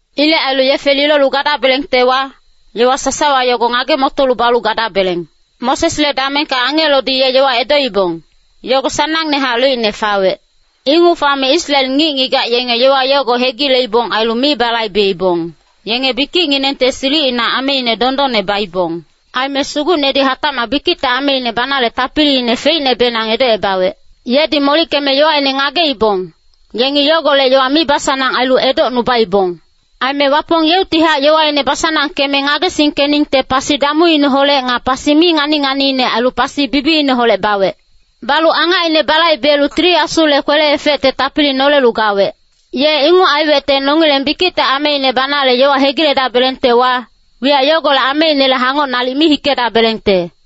Ilec ailu yefe lilolu gadabelengtewa, yowa sasawa yogo ngage-motolu balu gadabeleng. Mosesle damengka angelodi ye yowa edoibong, yogo sanangnehac loicne fawec. Inguc fame Israel ngic-ngigac yenge yowa yogo hegileibong ailu mi balaibebong, yenge bikicnginengte silicina ameine dondonne baibong. Aime Sugucnedi hatacmac bikicte ameine banale tapiliine feicnebenang edocebawec. Yedi molickeme yowaine ngageibong, yengi yogolec yowa mibasanang ailu edocnubaibong. Aime Wapong yeuctihac yowaine basanangkeme ngagesingkeningte pasi damuineholec nga pasi mi ngani-nganiine ailu pasi bibiineholec bawec. Balu angacine balaibelu Tili Asule kwele-efecte tapili nolelu gawec. Ye inguc aiwecte nongileng bikicte ameine banale yowa hegiledabelengtewa, wiyac yogolec ameinele hangoc nalic mi hikedabelengte.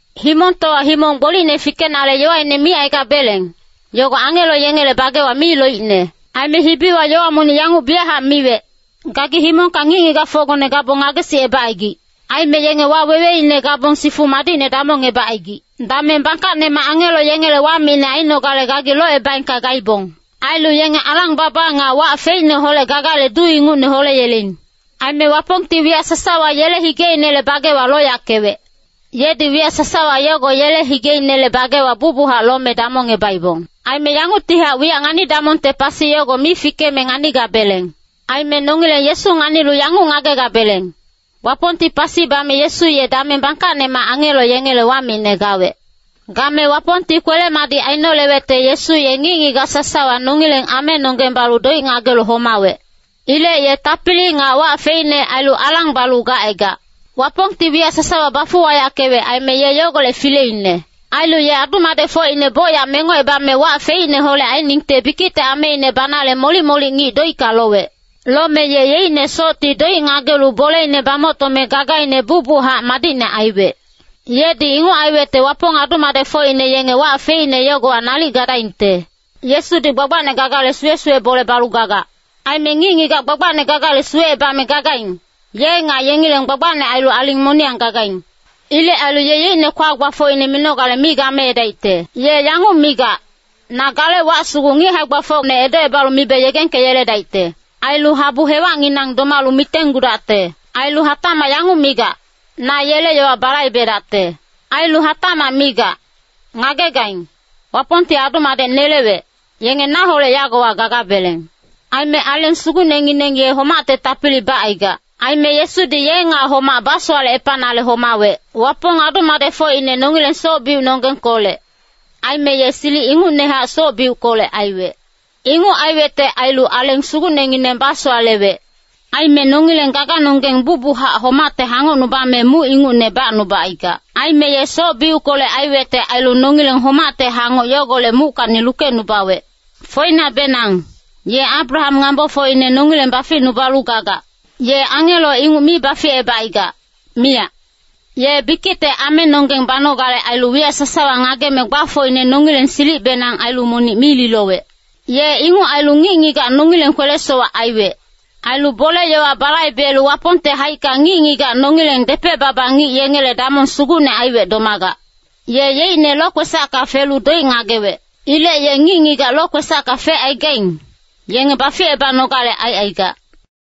Himongtowa himong gbolicne fikenale yowaine micaigabeleng, yogo angelo yengele bagewa mi loicne. Aime hibiwa yowa monic yanguc biyachac miwec, “Gagi himongka ngic-ngigacfocgone gabong ngagesicebacaigic. Aime yenge waweweine gabong sifu madicne damongebacaigic. Dameng bangkacnemac angelo yengele wamicne ainogale gagi locebaengka gaibong. Ailu yenge alang-baba nga wac feicneholec gagale duu ingucne holeyeleing. Aime Wapongti wiyac sasawa yele higeinele bagewa loyackewec.” Yedi wiyac sasawa yogo yele higeinele bagewa bucbuchac lome damongebaibong. Aime yanguctihac wiyac ngani-damongte pasi yogo mi fikeme nganigabeleng. Aime nongileng Yesu nganilu yanguc ngagegabeleng, Wapongti pasi bame Yesu ye dameng bangkacnemac angelo yengele wamicne gawec. Game Wapongti kwele-madic ainolewecte Yesu ye ngic-ngigac sasawa nongileng amenonggeng balu doic ngagelu homawec. Ilec ye tapili nga wac feicne ailu alang balu gacaigac. Wapongti wiyac sasawa bafuwayackewec aime ye yogolec fileine. Ailu ye adu-madecfocine bocyac mengocebame wac feicneholec ainingte bikicte ameine banale molic-molic ngic doicka lowec. Lome ye yeicne socti doic ngagelu boleine bamoctome gagaine bucbuchac madicne aiwec. Yedi inguc aiwecte Wapong adu-madecfocine yenge wac feicne yogowa nalic gadaingte. Yesudi gbagbacne gagale suwe-suwe bole balu gagac. Aime ngic-ngigac gbagbacne gagale suwecebame gagaing, ye nga yengileng gbagbacne ailu aling moniyang gagaing. Ilec ailu ye yeicne kwa-gbafocine minogale mi gameedaicte. Ye yanguc migac, “Na gale wac sugu ngic hae-gbafocne edocebalu mibe yegengkeyeledaicte. Ailu habu hewacnginang domalu mitenggudacte.” Ailu hatacmac yanguc migac, “Na yele yowa balaibedacte.” Ailu hatacmac migac, “Ngagegaing, Wapongti adu-madec nelewec, yenge naholec yagowa gagabeleng.” Aime Aleng Sugucnengineng ye homacte tapili bacaigac. Aime Yesudi ye nga homac basowalecepanale homawec. Wapong adu-madecfocine nongileng soc-biucnonggengkolec, aime ye silic ingucnehac soc-biuckolec aiwec. Inguc aiwecte ailu Aleng Sugucnengineng basowalewec. Aime nongileng gaganonggeng bucbuchac homacte hangocnubame muc ingucne bacnubacaigac. Aime ye soc-biuckolec aiwecte ailu nongileng homacte hangoc yogolec muckacni lukecnubawec. Foinacbenang, ye Abraham ngambofocine nongileng baficnubalu gagac. Ye angelo inguc mi baficebacaigac, miyac. Ye bikicte amenonggeng banogale ailu wiyac sasawa ngageme gbafocine nongileng silicbenang ailu monic mi lilowec. Ye inguc ailu ngic-ngigac nongileng kwele-sowac aiwec. Ailu bole-yowa balaibelu Wapongte haicka ngic-ngigac nongileng depec-baba ngic yengele damong sugucne aiwec domagac. Ye yeicne lokwesacka felu doic ngagewec. Ilec ye ngic-ngigac lokwesacka fecaigaing, yenge baficebanogale aicaigac.